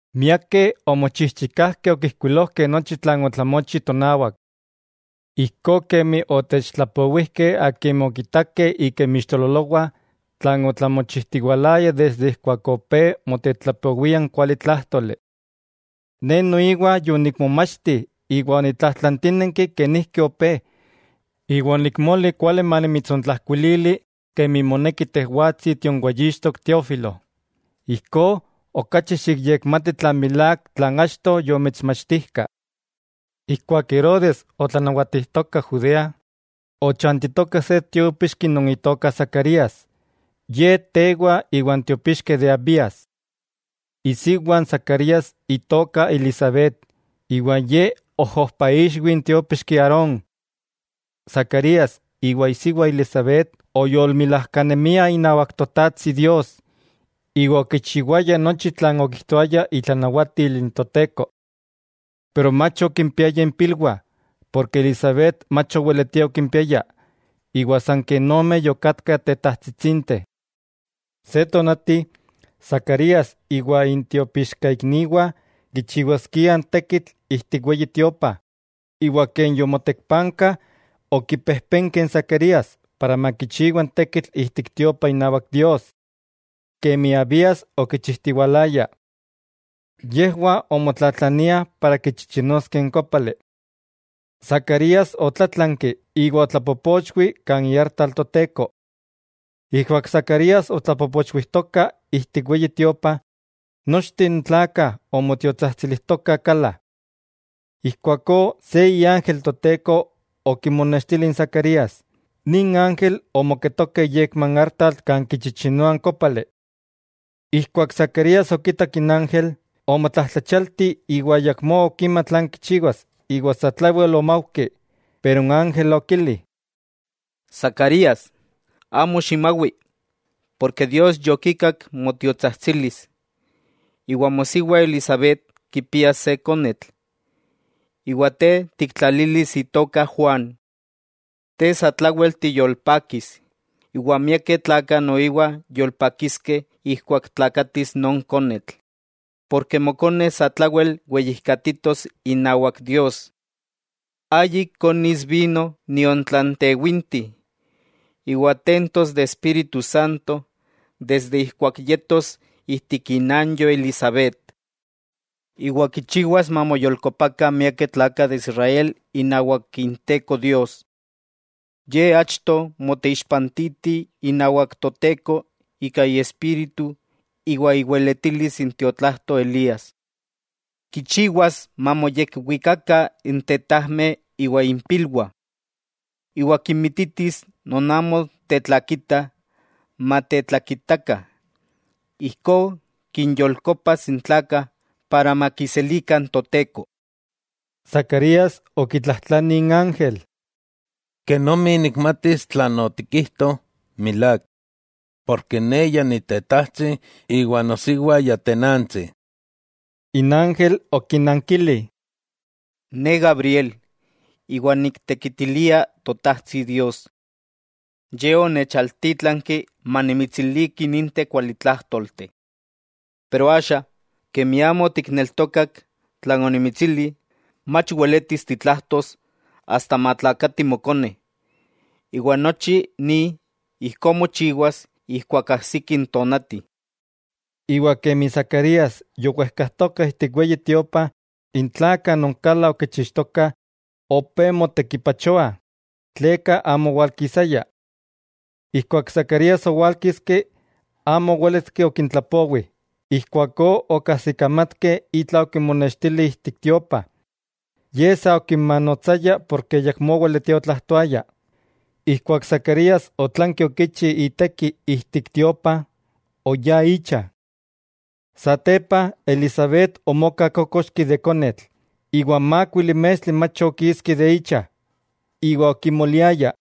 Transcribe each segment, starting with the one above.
Miakeh omochijchikajkeh okijkuilojkeh nochi tlan otlamochi tonawak. Ijkó kemi otechtlapowijkeh akimeh okitakeh ika inmixtololowah tlan otlamochijtiwalaya desde ijkuak opé motetlapowiah n kualitlájtoli. Ne noiwa yonikmomachti iwa onitlajtlantínenki kenijki opé, iwa onikmoli kuali manimitsontlajkuilili kemi moneki tejwatsi tionweyixtok Teófilo. Ijkó, okachi xikyekmati tlan milák tlan achto yomitsmachtijkah. Ijkuak Herodes otlanawatijtoka Judea, ochantitoka se tiópixki non itoka Zacarías, ye tewa iwan tiopixkeh de Abías. Isiwa n Zacarías itoka Elisabet. Ye ojojpaixwi n tiópixki Aarón. Zacarías iwa isiwa Elisabet oyolmilajkanemiah inawak n Totajtsi Dios, iwa okichiwayah nochi tlan okijtoaya itlanawatil n Toteko. Pero mach okimpiayah impilwah, porke Elisabet mach oweletia okimpiaya, iwa san ken omeh yokatkah tetajtsitsinteh. Se tonati, Zacarías iwa intiopixkaikniwah kichiwaskiah n tekitl ijtik Weyi Tiopa, iwa ken yomotekpankah, okipejpenke n Zacarías para makichiwa n tekitl ijtik Tiopa inawak Dios, kemi Abías okichijtiwalaya. Yejwah omotlatlaniah para kichichinoskeh n kópali. Zacarías otlátlanki iwa otlapopochwi kan iartal Toteko. Ijkuak Zacarías otlapopochwijtoka ijtik Weyi Tiopa, nochteh n tlakah omotiotsajtsilijtokah kala. Ijkuakó se iángel Toteko okimonextili n Zacarías, nin ángel omoketoka iyekma n artal kan kichichinoah n kópali. Ijkuak Zacarías okitak n ángel, omotlajtlachialti iwa ayakmó okima tlan kichiwas iwa satlawel omaujki. Pero n ángel okili: —Zacarías, amo ximawi, porke Dios yokikak motiotsajtsilis, iwa mosiwa Elisabet kipias se konetl, iwa te tiktlalilis itoka Juan. Te satlawel tiyolpakis, iwa miakeh tlakah noiwa yolpakiskeh ijkuak tlakatis non konetl, porke mokone satlawel weyijkatitos inawak Dios. Ayik konis vino nion tlan tewinti, iwa tentos de Espíritu Santo desde ijkuak yetos ijtik inanyo Elisabet. Iwa kichiwas mamoyolkopakah miakeh tlakah de Israel inawak Inteko Dios. Ye achto moteixpantiti inawak Toteko ika iespíritu iwa iweletilis n tiotlajto Elías. Kichiwas mamoyekwikakah n tetajmeh iwa impilwah. Iwa kinmititis non amo tetlakitah, matetlakitakah, ijkó kinyolkopas n tlakah para makiselikah n Toteko. Zacarías okitlajtlani n ángel: —¿Kenomi nikmatis tlan otikijto milák?, ne ya nitetajtsi iwa nosiwa ya tenantsi. N ángel okinankili: —Ne Gabriel, iwa niktekitilia Totajtsi Dios. Ye onechaltítlanki manimitsiliki ninteh kualitlájtolteh. Pero axa, kemi amo otikneltokak tlan onimitsili, mach weletis titlajtos asta matlakati mokone, iwa nochi ni ijkó mochiwas ijkuak ajsiki n tonati. Iwa kemi Zacarías yowejkajtoka ijtik Weyi Tiopa, n tlakah non kala okichixtokah opé motekipachoah tleka amo owalkisaya. Ijkuak Zacarías owálkiski, amo owéletki okintlapowi, ijkuakó okajsikamatkeh itla okimonextili ijtik tiopa. Ye sa okinmanotsaya porke ayakmó oweletia otlajtoaya. Ijkuak Zacarías otlanki okichi iteki ijtik Tiopa, oyá icha. Satepa Elisabet omoka kókoxki de konetl, iwa mákuili mestli mach okiski de icha, iwa okimoliaya: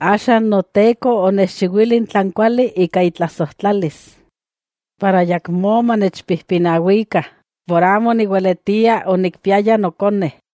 “Axa n Noteko onechchiwili tlan kuali ika itlasojtlalis, para ayakmó manechpijpinawikah por amo oniweletia onikpiaya nokone.”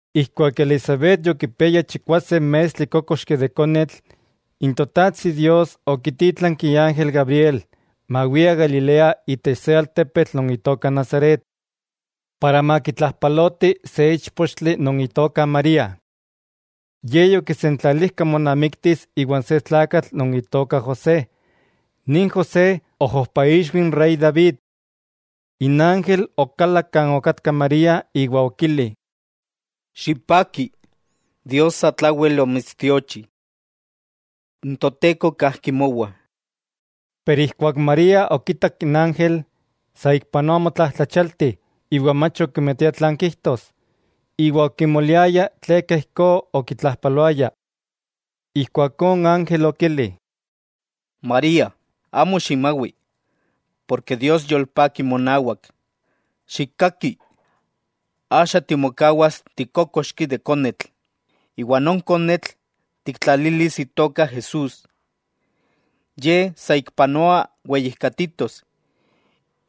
Ijkuak Elisabet yokipiaya chikwase mestli kókoxki de konetl, n Totajtsi Dios okitítlanki iángel Gabriel mawia Galilea itech se altepetl non itoka Nazaret, para makitlajpaloti se íchpochtli non itoka María. Ye yokisentlalijka monamiktis iwan se tlakatl non itoka José, nin José ojojpaixwi n Rey David. N ángel okalak kan okatka María iwa okili: —¡Xipaki! Dios satlawel omitstiochi. N Toteko kajki mowa. Pero ijkuak María okitak n ángel, saikpanoa omotlajtlachialti iwa mach okimatia tlan kijtos, iwa okimoliaya tleka ijkó okitlajpaloaya. Ijkuakó n ángel okili: —María, amo ximawi, porke Dios yolpaki monawak. ¡Xikkaki!, axa timokawas tikókoxki de konetl, iwa non konetl tiktlalilis itoka Jesús. Ye saikpanoa weyijkatitos,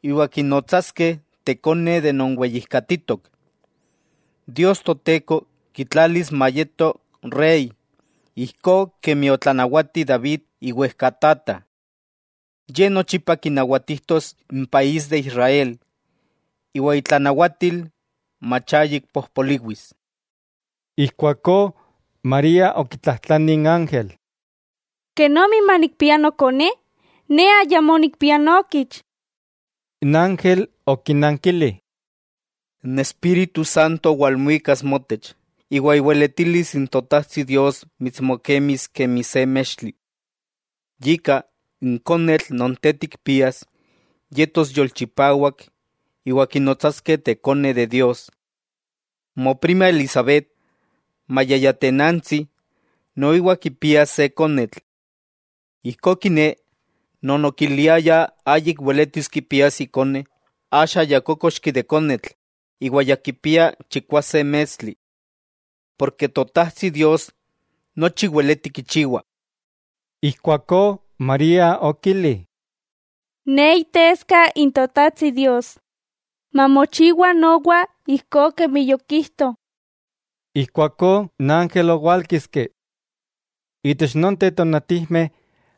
iwa kinotsaskeh Tekone de non Weyijkatitok. Dios Toteko kitlalis mayeto Rey ijkó kemi otlanawati David iwejkatata. Ye nochipa kinawatijtos n país de Israel, iwa itlanawatil mach ayik pojpoliwis. Ijkuakó María okitlajtlani n ángel: —¿Kenomi manikpia nokone, ne ayamó nikpia nookich? N ángel okinankili: —N Espíritu Santo walmuikas motech, iwa iweletilis n Totajtsi Dios mitsmokemis kemi se mextli. Yika, n konetl non te tikpias yetos yolchipawak iwa kinotsaskeh Tekone de Dios. Moprima Elisabet, maya ya tenantsi, noiwa kipias se konetl. Ijkó kiné, non okiliayah ayik weletis kipias ikone axa ya kókoxki de konetl iwa ya kipia chikwase mestli. Porke Totajtsi Dios nochi weleti kichiwa. Ijkuakó María okili: Ne iteska n Totajtsi Dios. Mamochiwa nowa ijkó kemi yokijto. Ijkuakó n ángel owálkiski. Itech nonteh tonatijmeh,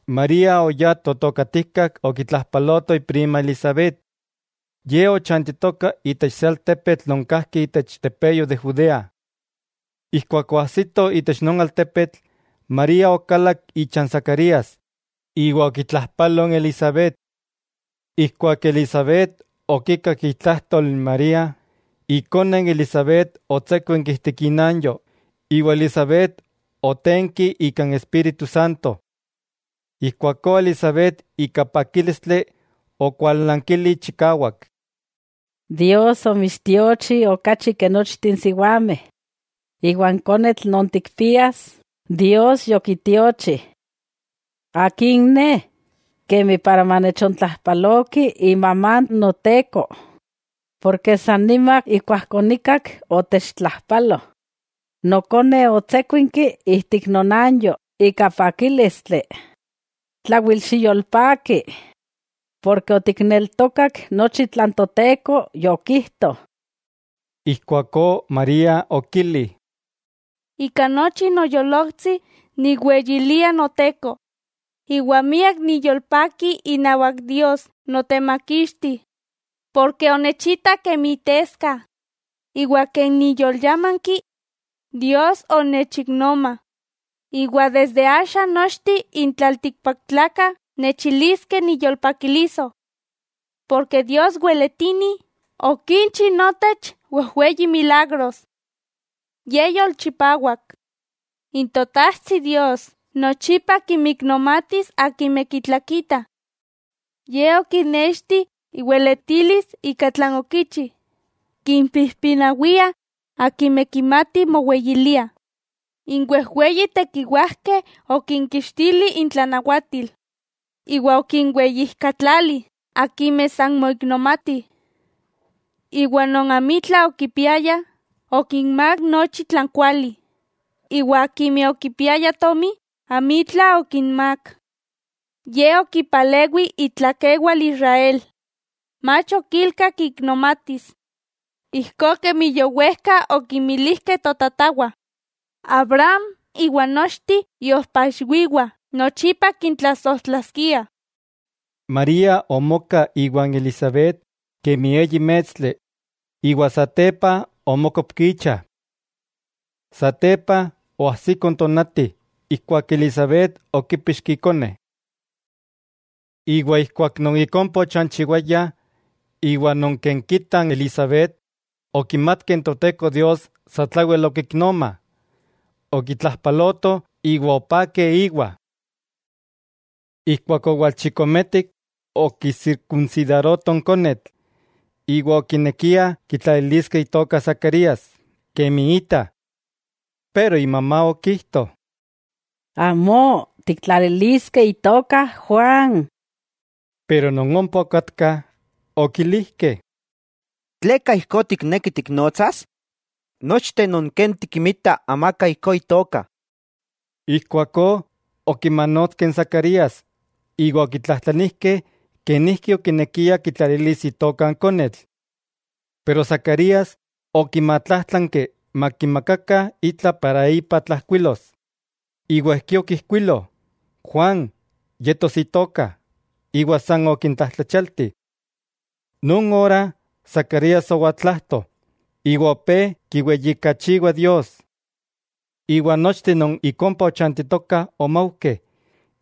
María oyá totokatijkak okitlajpaloto iprima Elisabet. Ye ochantitoka itech se altepetl non kajki itech tepeyo de Judea. Ijkuak oajsito itech non altepetl, María okalak icha n Zacarías, iwa okitlajpalo n Elisabet. Ijkuak Elisabet okikak itlajtol n María, ikone n Elisabet otsékuinki ijtik inanyo, iwa Elisabet otenki ika n Espíritu Santo. Ijkuakó Elisabet ika pakílistli okualnankili chikawak: —¡Dios omitstiochi okachi ke nochteh n siwameh, iwa n konetl non tikpias, Dios yokitiochi! ¿Akin ne, para manechontlajpaloki imamá n Noteko? Porke san nima ijkuak onikak otechtlajpalo, nokone otsékuinki ijtik nonanyo ika pakílistli. ¡Tlawel xiyolpaki, ken otikneltokak nochi tlan Toteko yokijto! Ijkuakó María okili: Ika nochi noyolojtsi nikweyilia Noteko, iwa miak niyolpaki inawak Dios, Notemakixti. Porke onechitak kemi iteska, iwa ken niyolyámanki, Dios onechiknoma, iwa desde axa nochteh n tlaltikpaktlakah nechiliskeh niyolpakiliso. Porke Dios weletini okinchi notech wejweyi milagros. ¡Ye yolchipawak! N Totajtsi Dios nochipa kinmiknomatis akimeh kitlakitah. Ye okinexti iweletilis ika tlan okichi, kimpijpinawia akimeh kimatih moweyiliah. N wejweyi tekiwajkeh okinkixtili intlanawatil, iwa okinweyijkatlali akimeh san moiknomatih. Iwa non amitla okipiayah okinmák nochi tlan kuali, iwa akimeh okipiayah tomi amitla okinmák. Ye okipalewi itlakewal Israel, mach okilka kiknomatis, ijkó kemi yowejka okimilijkeh totatawah, Abraham iwa nochteh iojpa ixwiwah nochipa kintlasojtlaskia. María omoka iwan Elisabet kemi eyi mestli, iwa satepa omókopki icha. Satepa oajsiko n tonati, ijkuak Elisabet okípixki ikone. Iwa ijkuak non ik ompa ochanchiwaya iwa non ken kita n Elisabet okimatkeh Toteko Dios satlawel okiknoma, okitlajpalotoh iwa opakeh íwa. Ijkuak owalchikometik okisirkunsidarotoh n konetl, iwa okinekiah kitlaliliskeh itoka Zacarías, kemi ita. Pero imamá okijto: —¡Amó, tiktlaliliskeh itoka Juan! Non ompa okatkah okilijkeh: —¿Tleka ijkó tikneki tiknotsas? nochteh non ken tikinmita, amaka ijkó itoka. Ijkuakó, okimanotskeh n Zacarías iwa okitlajtlanijkeh kenijki okinekia kitlalilis itoka n konetl. Pero Zacarías okimatlájtlanki makimakakah itla tlan ipa tlajkuilos, iwa ijkí okijkuilo: “Juan yetos itoka.” Iwa san okintlajtlachialti. Non ora Zacarías owaltlajto, iwa opé kiweyijkachiwa Dios. Iwa nochteh non ik ompa ochantitokah omaujkeh,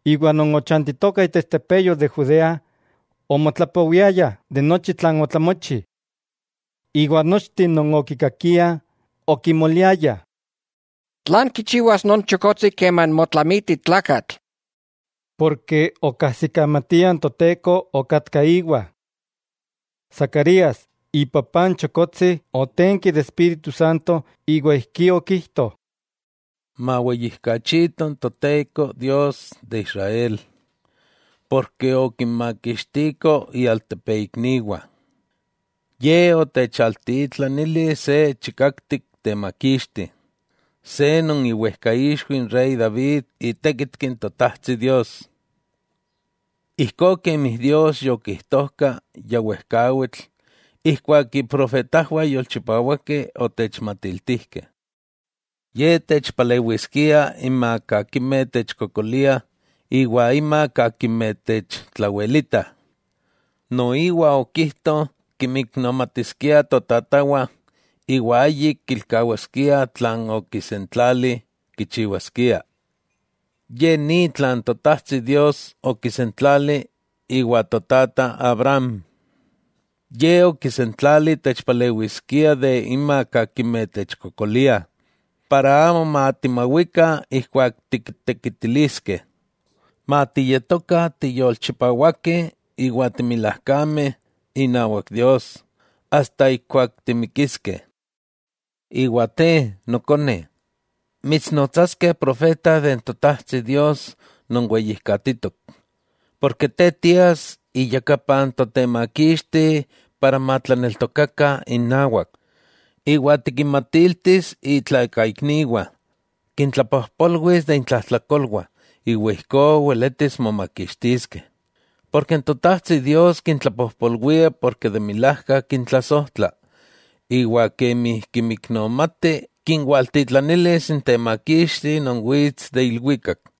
iwa non ochantitokah itech tepeyo de Judea, omotlapowiayah de nochi tlan otlamochi. Iwa nochteh non okikakiah, okimoliayah: —¿Tlan kichiwas non chokotsi keman motlamiti tlakatl? Porke okajsikamatiah n Toteko okatka íwa. Zacarías, ipapá n chokotsi otenki de Espíritu Santo iwa ijkí okijto: Maweyijkachito n Toteko Dios de Israel, porke okinmakixtiko ialtepeikniwah. Ye otechaltitlanili se chikaktik temakixti, se non iwejkaixwi n Rey David itékitki n Totajtsi Dios. Ijkó kemi Dios yokijtojka ya wejkawitl ijkuak iprofetajwah yolchipawakeh otechmatiltijkeh: Ye techpalewiskia inmak akimeh techkokolia iwa inmak akimeh techtlawelitah. Noiwa okijto kinmiknomatiskia totatawah iwa ayik kilkawaskia tlan okisentlali kichiwaskia. Ye ni tlan Totajtsi Dios okisentlali iwa totata Abraham: Ye okisentlali techpalewiskia de inmak akimeh techkokoliah, para amo matimawikah ijkuak tiktekitiliskeh, matiyetokah tiyolchipawakeh iwa timilajkameh inawak Dios, asta ijkuak timikiskeh. Iwa te, nokone, mitsnotsaskeh profeta de n Totajtsi Dios non weyijkatitok. Porke te tias iyakapa n Totemakixti para matlaneltokakah inawak, iwa tikinmatiltis itlakaikniwah, kintlapojpolwis de intlajtlakolwah, iwa ijkó weletis momakixtiskeh. Porke n Totajtsi Dios kintlapojpolwia ken milák kintlasojtla. Iwa kemi kinmiknomati kinwaltitlanilis n Temakixti non wits de ilwikak,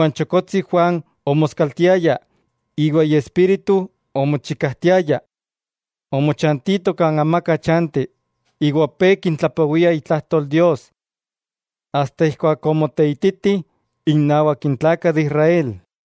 N chokotsi Juan omoskaltiaya iwa iespíritu omochikajtiaya. Omochantito kan amaka chanti iwa opé kintlapowia itlajtol Dios asta ijkuak omoteititi innawak n tlakah de Israel.